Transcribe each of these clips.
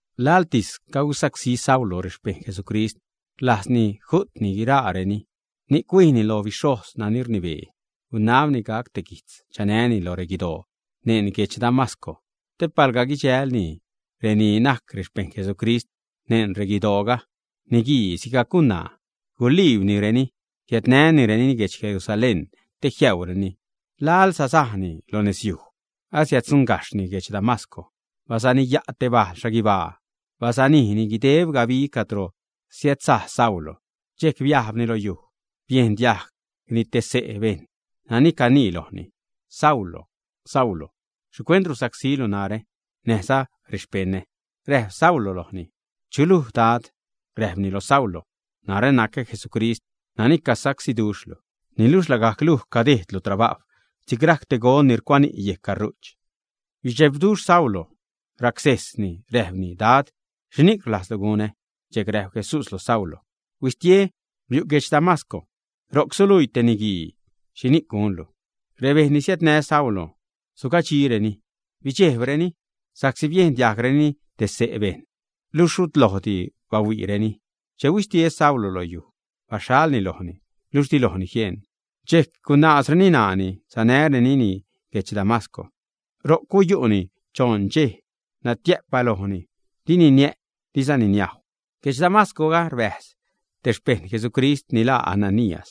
Laḻtis cagusacsí Saulo rexpejṉ Jesucrist. Rlajzni ju'tni guiraareni, ni'c huijni lo bixhojz nani rnibee, gunabni gac te guijtz chanäni lo reguidoo neṉ guedx Damasco te palga guidxälni reni najc xpejṉ Jesucrist neṉ reguidooga, niguii sigac gunaa, guliibnireni, jiädnänireni guedx Jerusalén te jiäureni. Laḻ sasajni lo nezyuj, asiäddzuṉgajxhni guedx Damasco, basaniya' te bal xhaguibaa, basanijni guideb gabi cadro siädsaj Saulo. Dxejc biajbni lo yuj, biejn diajgni te xse' bejṉ nani canii lojni: ―Saulo, Saulo, ¿xhicuent rusacsílu narä, näjza rexpeṉa? Räjp Saulo lojni: ―¿Chuluj Dad? Räjpni lo Saulo: ―Narä nacä Jesucrist, nani cagusacsíduxhlu. Niluxh lagajc luj cadejdlu trabajw si'c rajc te gon ni rucuani' yejc caru'ch. Bidxebduxh Saulo, racsejsni räjpni: ―Dad, ¿xhini'c rlajzlu gunä? Dxejc räjp Jesús loj Saulo: ―Huistie, biu' guedx Damasco. Ro'c suluii te niguii xhini'c gunlu. Rebejṉ ni siädnä Saulo sugadxireni, bidxejbreni sa'csi biejn diajgreni te xse' bejṉ, luxh rut lojdi bahuiireni. Che huistie Saulo lo yuj, baxhalni lojni, niluxh di lojni jieṉ. Dxejc gunaazreni ṉaani, sanärenini guedx Damasco. Ro'c guyu'ni choṉ dxej, natiä'p balojni, dini niä', dizani niajw. Guedx Damasco rbäjz te xpejṉ Jesucrist ni laa Ananías.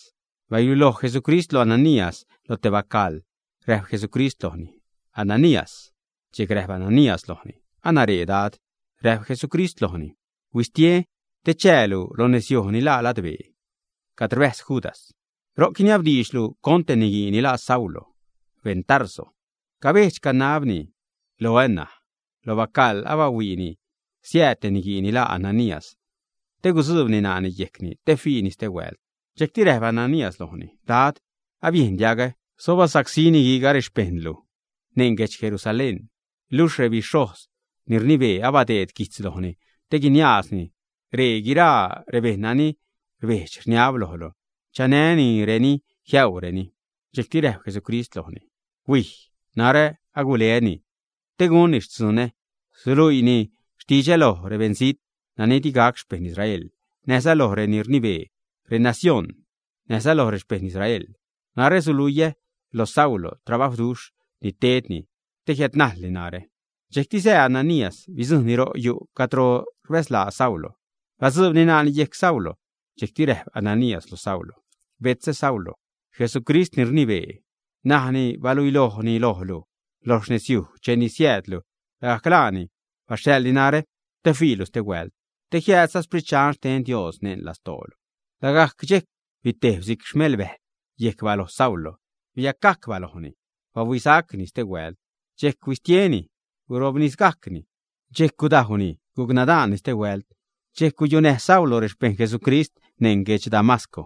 Baluiloj Jesucrist loj Ananías lo te bacaḻ, räjp Jesucrist lojni: ―Ananías. Dxejc räjp Ananías lojni: ―Anaree Dad. Räjp Jesucrist lojni: ―Huistie te chäälu lo nezyuj ni laa Ladbee cad rbäjz Judas. Ro'c guiniabdiidxlu con te niguii ni laa Saulo, beṉ Tarso. Cabejdx, canabni loä ṉaj. Lo bacaḻ abahuiini siääd te niguii ni laa Ananías te gutzuubni ṉaani yejcni te fiini stehuält. Dxejcti räjp Ananías lojni: ―Dad, abiejn diagä xho basacsí niguiiga rexpejṉlu neṉ guedx Jerusalén. Luxh rebixhojz ni rnibee abadeed guijtz lojni te guiniaazni ree guiraa rebejṉ nani rbedx-rniab lojlu, chanänireni jiäureni. Dxejcti räjp Jesucrist lojni: ―Huij, narä aguleäni te gunni xtzunä. Suluiini xtidxä loj rebeṉzijt nani digac xpeṉ Israel, näjza loj reni rnibee renacioṉ, näjza loj rexpejṉ Israel. Narä suluiä lo Saulo trabajwduxh ni tedni te jiädnajlni narä. Dxejcti sää Ananías, bidzujṉni ro yu' cadro rbäzlaa Saulo. Batzuubni ṉaani yejc Saulo. Dxejcti räjp Ananías loj Saulo: ―Betzä Saulo, Jesucrist ni rnibee, nani baluiloj lojlu lo nezyuj cheni siäädlu, lagajc laani baxhaḻni narä te fiilu stehuält, te jiädläjzza Sprit Dxan xten Dios neṉ lastoolu. Lagajc dxejc bitejb si'c xmelbäjl yec baloj Saulo, biacgajc balojni, bahuisa'cni stehuält. Dxejc huistieni, gurobnisgajcni. Dxejc gudajwni, guc nadaanni stehuält. Xchej guyunäj Saulo rexpejṉ Jesucrist neṉ guedx Damasco.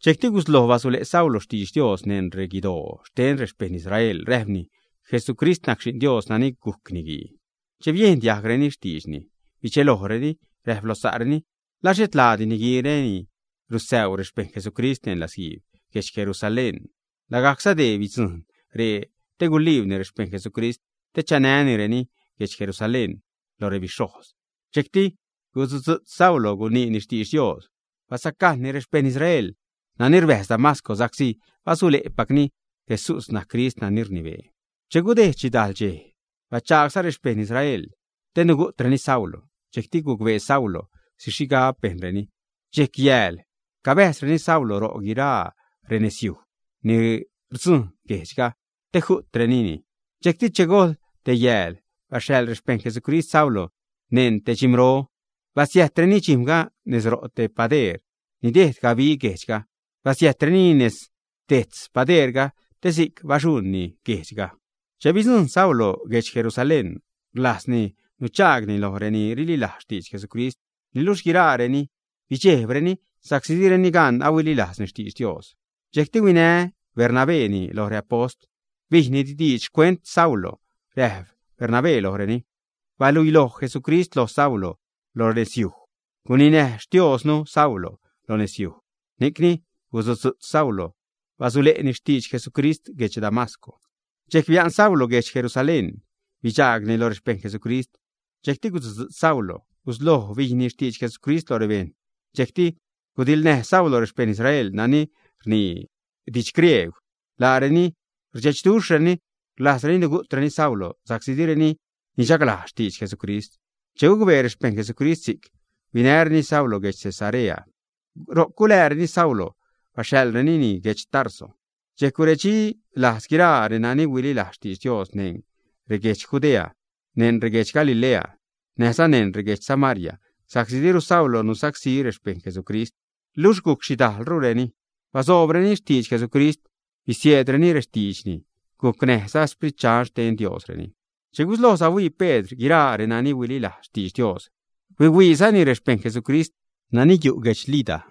Dxejcti gusloj basule' Saulo xtidx Dios neṉ reguidoo xten rexpejṉ Israel, räjpni: ―Jesucrist najc Xi'n Dios nani gujc Niguii. Che biejn diajgreni xtiidxni, bidxelojreni, räjp lo sa'reni: ―¿La xhet laadi niguiire ni rusäu rexpejṉ Jesucrist neṉ latzguiib guedx Jerusalén, ä? Lagajcza dee bidzujṉ ree te guliibni rexpejṉ Jesucrist te chanänireni guedx Jerusalén lo rebixhojz. Dxejcti gusutzu'tz Saulo guniini xtidx Dios. Basacajṉni rexpejṉ Israel nani rbäjz Damasco sa'csi basule'pacni Jesús najc Crist nani rnibee. Che gudejd xhidajl dxej, bachagsa' rexpejṉ Israel te nugu'treni Saulo. Dxejcti gucbee Saulo xhi xhigab bejnreni. Dxej, yääl cabäjzreni Saulo ro' guiraa renezyuj ni rdzujṉ guejdxga te ju'trenini. Dxejcti che gojḻ te yääl basäḻ rexpejṉ Jesucrist Saulo neṉ te dxim̲ro, basiäjtreni dxijm̲ga nez ro' te padeer ni dejd gabi guejdxga. Basiäjtrenini nez dejtz padeerga, te si'c baxuṉni guejdxga. Che bidzujṉ Saulo guedx Jerusalén, rlajzni nuchaagni loj reni rililajz xtidx Jesucrist, niluxh guiraareni bidxejbrenini sa'csi direni gan ahuililajzni xtidx Dios. Dxejcti huinä Bernabéni lo reapost, bijni diidx xcuent Saulo. Räjp Bernabé lojreni: ―Baluiloj Jesucrist lo Saulo loj nezyuj. Guninäj Xtioznu Saulo loj nezyuj, ni'cni gusutzu'tz Saulo basule'ni xtidx Jesucrist guedx Damasco. Dxejc bia'n Saulo guedx Jerusalén, bidxaagni lo rexpejṉ Jesucrist. Dxejcti gusutzu'tz Saulo gusloj bijni xtidx Jesucrist lo rebejṉ. Dxejcti gudiḻnäj Saulo rexpejṉ Israel nani rnii didx griegw. Laareni rdxechduxhreni, rlajzreni nugu'treni Saulo sa'csi direni nichaglajz xtidx Jesucrist. Che gucbee rexpejṉ Jesucrist si'c, huinäreni Saulo guedx Cesarea, ro'c gulääreni Saulo, baxhaḻrenini guedx Tarso. Dxejc guredxi lajz guiraa renani huililajz xtidx Dios neṉ reguedx Judea, neṉ reguedx Galilee, näjza neṉ reguedx Samaria, sa'csi diru Saulo nusacsí rexpejṉ Jesucrist, luxh guc xhidajlrureni. Basoobreni xtidx Jesucrist, bisieedrureni rextiidxni, gucnäjza Sprit Dxan xten Diosreni. Che gusloj sahuii Pedr guiraa renani huililajz xtidx Dios, huihuiizani rexpejṉ Jesucrist nani yu' guedx Lida.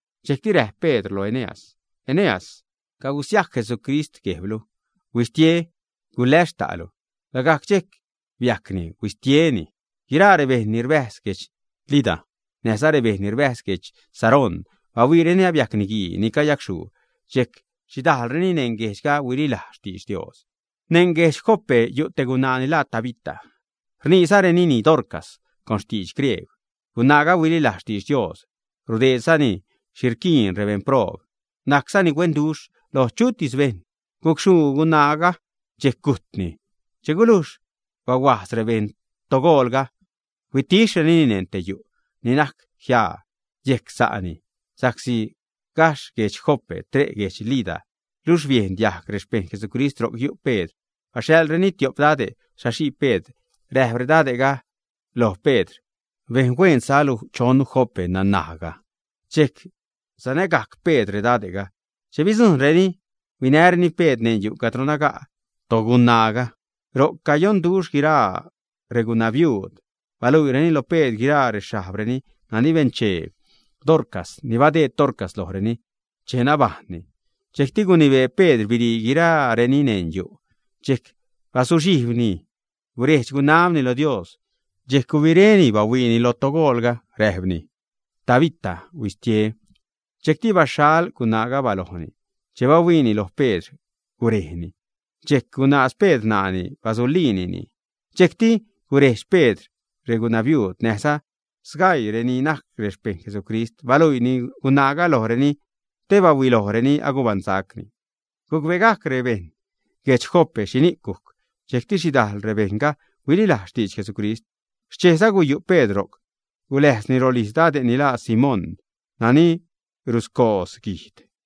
Dxejcti räjp Pedr lo Eneas: ―Eneas, cagusiajc Jesucrist guejblu. Huistie, guläs xta'lu. Lagajc dxejc biajcni, huistietini. Guiraa rebejṉ ni rbäjz guedx Lida, näjza rebeṉ ni rbäjz guedx Sarón, bahuiireni abiajc niguii ni cayacxhuu. Dxejc xhidajlreni neṉ reguejdxga huililajz xtidx Dios. Neṉ guedx Jope yu' te gunaa ni laa Tabita; rniizarenini Dorcas con xtidx griegw. Gunaaga huililajz xtidx Dios, rudeedzani xhi rquiin rebeṉproob, najczani huenduxh loj chutis bejṉ. Gucxhuu gunaaga, dxejc gujtni. Che gulujx bahuajz rebejṉ togoolga, huitixhrenini neṉ te yu' ni najc jiaa yejc sa'ni. Sa'csi gajxh guedx Jope tre' guedx Lida, luxh biejn diajg rexpejṉ Jesucrist ro'c yu' Pedr, baxhaḻreni tiop dade' saxii Pedr. Räjp redade'ga loj Pedr: ―Bejn huen salu chonnu Jope naṉajga. Dxejc sanägajc Pedr redade'ga. Che bidzujṉreni, huinäreni Pedr neṉ yu' cadro naga' togunaaga. Ro'c cayonduxh guiraa regunabiuud, baluiireni lo Pedr guiraa rexhajbreni nani benchee Dorcas, ni badeed Dorcas lojreni che nabajṉni. Dxejcti gunibee Pedr birii guirareni neṉ yu'. Dxejc bazuxhijbni, guredx-gunabni loj Dios. Dxejc gubiréni bahuiini loj togoolga, räjpni: ―Tabita, huistie. Dxejcti baxhal gunaaga balojni; che bahuiini loj Pedr, gurejni. Dxejc gunaaz Pedr ṉaani, basuliinini, dxejcti gurejdx Pedr regunabiuud näjza sgaii reni najc rexpejṉ Jesucrist. Baluiini gunaaga lojreni te bahuilojreni agubaṉsacni. Gucbegajc rebeṉ guedx Jope xhini'c gujc, dxejcti xhidajl rebejṉga huililajz xtidx Jesucrist. Xchejza guyu' Pedr ro'c, guläjzni rolijz dade' ni laa Simón, nani ruscoodz guijd.